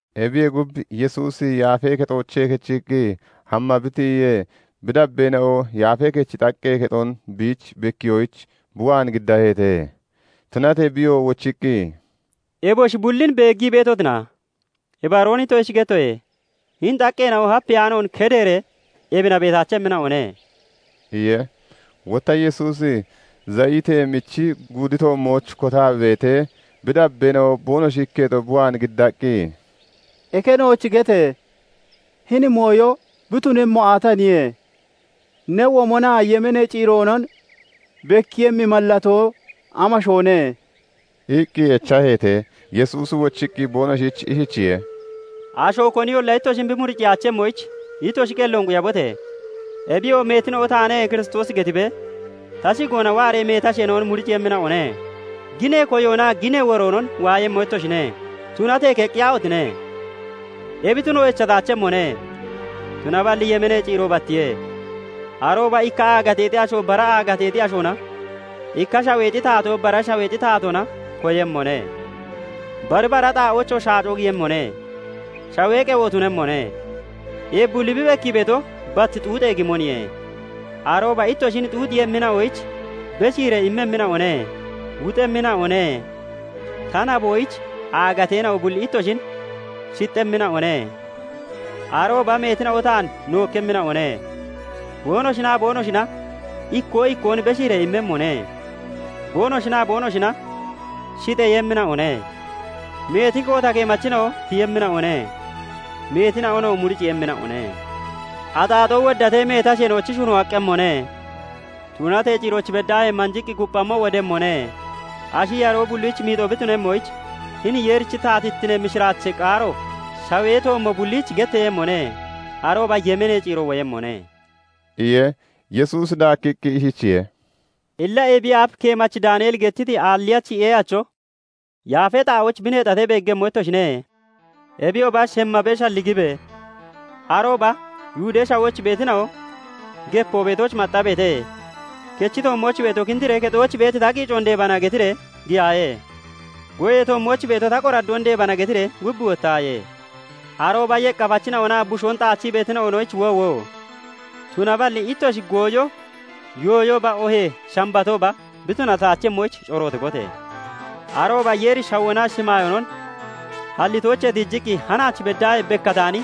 Ebiyee gub, Yesuusi Yaafee Kexoochee kechiqqi hamma bi tiyiyee, bi dabbeena'o Yaafee Kechi xaqqee kexon biich bekkiyoyich bi waan giddaheete. Tunatee biyoo wochiqqi, "Eboshi bullin beeggii beetotina? Ibaroon ittoshich gettoye; hini xaqqeena'o hapiyaanoon keddeeree ebina beetaachemmina'one" iye. Wotta Yesuusi Zayitee Michi Guudi toommooch kotaa bi beetee, bi dabbeena'o boonoshi ikketo bi waan giddaqqi, "Eke nooch gete! Hini mooyo bi tunemmo aataniye? Ne womonaa yemeenee ciiroonon bekkiiyemmi mallatoo amashoone?" iqqi echaheete. Yesuusi wochiqqi boonoshich ishichiye:- "Asho koniyolla ittoshin bi muriciyaachemmoyich, ittoshi qelloon quyabote! Ebiyoo meetina'o 'Taane Kiristoosi' getibee ta shigoona waaree meeti asheena'on muriciiyemmina'one. Ginee koyoonaa ginee woroonon waayemmo ittoshine; tunatee keqqiyaahotine! Ebi tuno echataachemmone. Tunaballi yemeenee ciiro battiye. Arooba ikka aagateexi asho bara aagateexi ashoona, ikka shaweexi taatoo bara shaweexi taatoona koyemmone; bari bara xaa'oochoo shaacoo giyemmone; shawee qewo tunemmone. Ebi bulli bi bekkii beeto, bat xuuxee gimoniye. "Arooba ittoshin xuuxiiyemmina'oyich beshiiree immemmina'one; wuxemmina'one; ta naboyich aagateena'o bulli ittoshin shixxemmina'one. Arooba meetina'o taan nookkemmina'one; boonoshinaa boonoshina ikkoo ikkoon beshiiree immemmone; boonoshinaa boonoshina shixeeyemmina'one. Meeti koota keemachina'o tiyemmina'one; meetina'onoo murciiyemmina'one. Axaaxoo woddatee, meeti asheena'ochi shuno aqqemmone. Tunatee ciirooch beddaahee manjiqqi kupphammo wodemmone. Ashi yaroo bullich miixoo bi tunemmoyich hini Yeerichi taatittinee mishiraachee qaaro shawee toommo bulliich getteeyemmone; arooba yemeenee ciiro woyemmone" iye. Yesuusi daakkiqqi ishichiye:- "Illa ebiyee aaf keemachi Daaneeli gettiti aalliyachi ee'acho yaafee xaa'ooch bi neexatee beeggemmo ittoshine. Ebiyooba shemmammo shalligibe. Arooba Yihudee Shawooch beetina'o gepoo beetooch maxxabeete. Kechi toommooch beeto 'Kindiree kexooch beeti ta qiicoon deebana' getiree giyaaye. Goyee toommooch beeto 'Ta qoraddoon deebana' getiree gub wottaaye. Arooba yeqqafachina'onaa bushoon xaachii beetina'onoyich woowo! Tunaballi ittoshi gooyo yooyooba oohee Shambatooba bi tunataachemmoyich corootibote! Arooba Yeeri shawoonaa shimaayoonon hallitoochee tiijiqqi hanaach beddaahee bekkataani,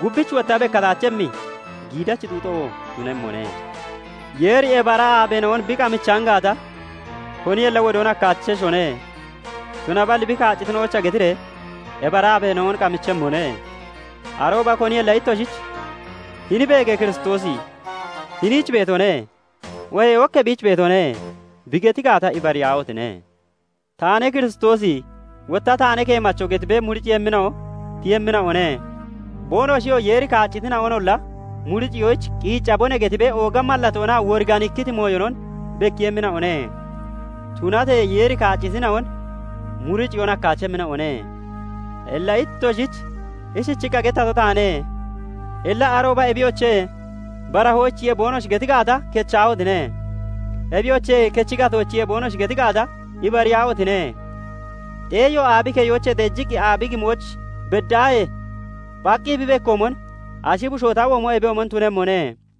gubbich wotta bekkataachemmi giidachi xuuxo tunemmone. Yeeri ebi ara aabeena'on bi qamichaan gaata, koniyolla wodoon hakkaacheshone; tunaballi bi kaaccitina'oyicha getiree ebi ara aabeena'on qamichemmone. Arooba koniyolla ittoshichch 'Hini beege! Kiristoosi hiniich beetone' oohee ok ebiich beetone' bi geti gaata, ibariyaahotine! 'Taane Kiristoosi', wotta 'Taane keemacho' getibee murciiyemmina'o tiyemmina'one. Boonoshiyoo 'Yeeri kaaccitina'onolla muriciyoyich qiiccabone' getibee ooga mallatoonaa woriganikkiti mooyonon bekkiiyemmina'one; tunatee Yeeri kaaccitina'on murciyoon hakkaachemmina'one. Illa ittoshich ishiichiqqa gettato taane. "Illa arooba 'Ebiyoche! Barahoochiye' boonoshi geti gaata, kechahotine! 'Ebiyoche! Kechi gatoochiye' boonoshi geti gaata, ibariyaahotine! Xeeyo aabi keyoochee xeejiqqi aabi gimooch beddaahee phaqqi bi bekkoomon, ashi bushoo ta womo ebiyoomon tunemmone.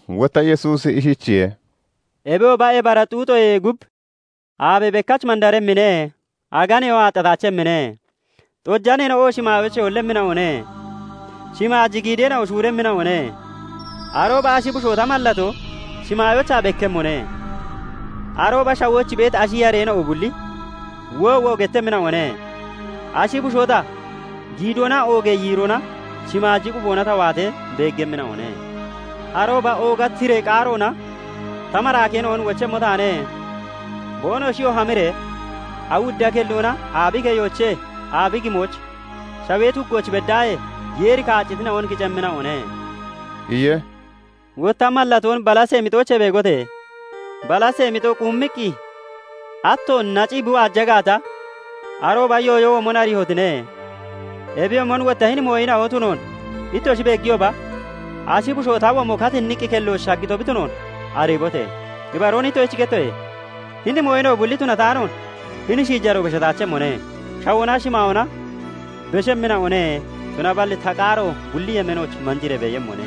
Wotta Yesuusi ishichiye:- "Ebiyooba ebi ara xuuxoyee gub 'Aabe bekkach mandaremmine; aganeyoo aaxxataachemmine; xojaneena'o shimaayoochee hollemmina'one; shimaaji giideena'o shuuremmina'one.' "Arooba ashi bushoo ta mallatoo shimaayoochaa bekkemmone; arooba shawooch beeti ashi yareena'o bulli 'Woowo!' gettemmina'one. Ashi bushoo ta, giidoonaa oogee yiiroona shimaaji quboona ta waatee beeggemmina'one. Arooba ooga tiree qaaroona ta maraakeena'on wochemmo taane. Boonoshiyoo hamiree awudda kelloona aabi keyoochee aabi gimooch, shawee tuggooch beddaahee Yeeri kaaccitina'on kicemmina'one" iye. "Wotta mallatoon balasee mixoochee beegote! Balasee mixo quummiqqi ato nacii (nocii) bi waaja gaata, arooba yooyo womon ariihotine! Ebiyoomon wotta hini mooyina'o tunoon ittoshi beegiyooba ashi bushoo ta womo katinniqqi kelloch shaggito bi tunoon ariibote! Ibaroon ittoshich gettoye; hini mooyina'o bulli tunataanoon hini shiijaroo beshataachemmone. Shawoonaa shimaayoona beshemmina'one; tunaballi ta qaaro bulli yemeenooch manjiree beeyemmone"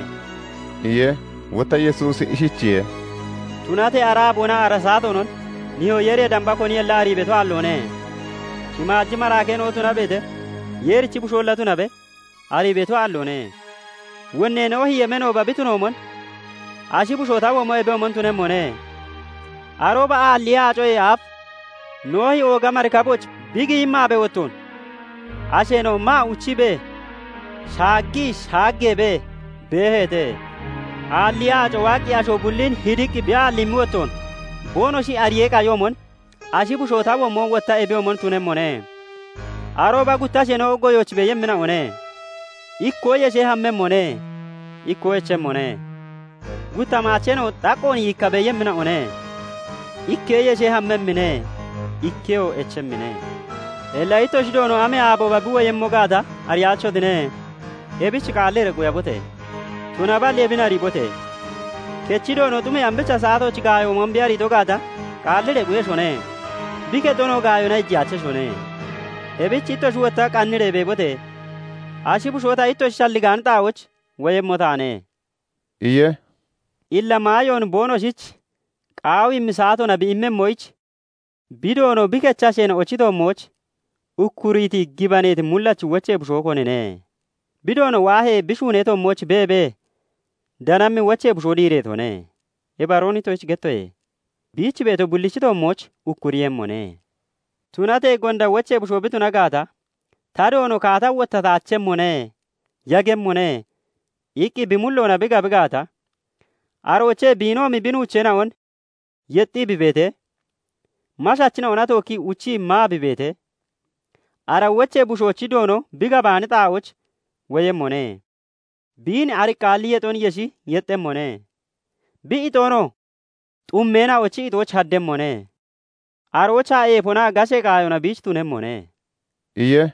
iye. Wotta Yesuusi ishichiye:- "Tunatee ara aaboonaa ara saatoonon nihoo Yeeriyee damba koniyolla arii beeto aalloone. Shimaaji maraakeena'o tunabeete, Yeerichi Busholla tunabe arii beeto aalloone. Wonnee Noohi yemeenooba bi tunoomon, ashi bushoo ta womo ebiyoomon tunemmone. Arooba aalliyee aacoyee aaf Noohi ooga marikabooch bi giyimmi aabee wottoon asheena'o maa uchiibee, shaaggii shaageebee beeheete. Aalliyee aaco waaqqi asho bullin hidiqqi bi aalliimmi wottoon boonoshi ariyee qayoomon, ashi bushoo ta womo wotta ebiyoomon tunemmone. Arooba gutta asheena'o goyooch beeyemmina'one; ikkoo yeshee hammemmone; ikkoo echemmone. Gutta maacheena'o xaqqoon yiikka beeyemmina'one; ikkee yeshee hammemmine; ikkeyoo echemmine. "Illa ittoshi Doono amee aabooba bi woyemmo gaata ariyaachotine. Ebich qaalliree quyabote! Tunaballi ebin ariibote! Kechi Doono xumee ambicha saatooch gaayo womon bi ariito gaata, qaalliree quyeshone; bi kexonoo gaayona iijiyaacheshone. Ebich ittoshi wotta qanniree beebote! Ashi bushoo ta ittoshi shalligaani xaa'ooch woyemmo taane" iye. "Illa maayoon boonoshich qaawiimmi saatoona bi immemmoyich bi doono bi kechi asheena'ochi toommooch ukkuriiti gibaneeti mullachi wochee bushoo konine? Bi doono waahee, bi shuunee toommooch beebee danammi wochee bushoo diireetone. Ibaroon ittoshich gettoye; biich beeto bullichi toommooch ukkuriiyemmone. Tunatee gonda wochee bushoo bi tuna gaata 'Ta doono kaata wottataachemmone; yagemmone' iqqi bi mulloona bi gabi gaata, aroochee biinoomi bi nuucheena'on yexxii bi beetee, mashachina'ona tookkii uchii maa bi beetee, ara wochee bushoochi doono bi gabaani xaa'ooch woyemmone; Biin ariqqaalli yexon yeshi yexxemmone; bi ixoonoo xummeena'ochi ixooch haddemmone. Aroochaa eefonaa gashee qaayona biich tunemmone" iye.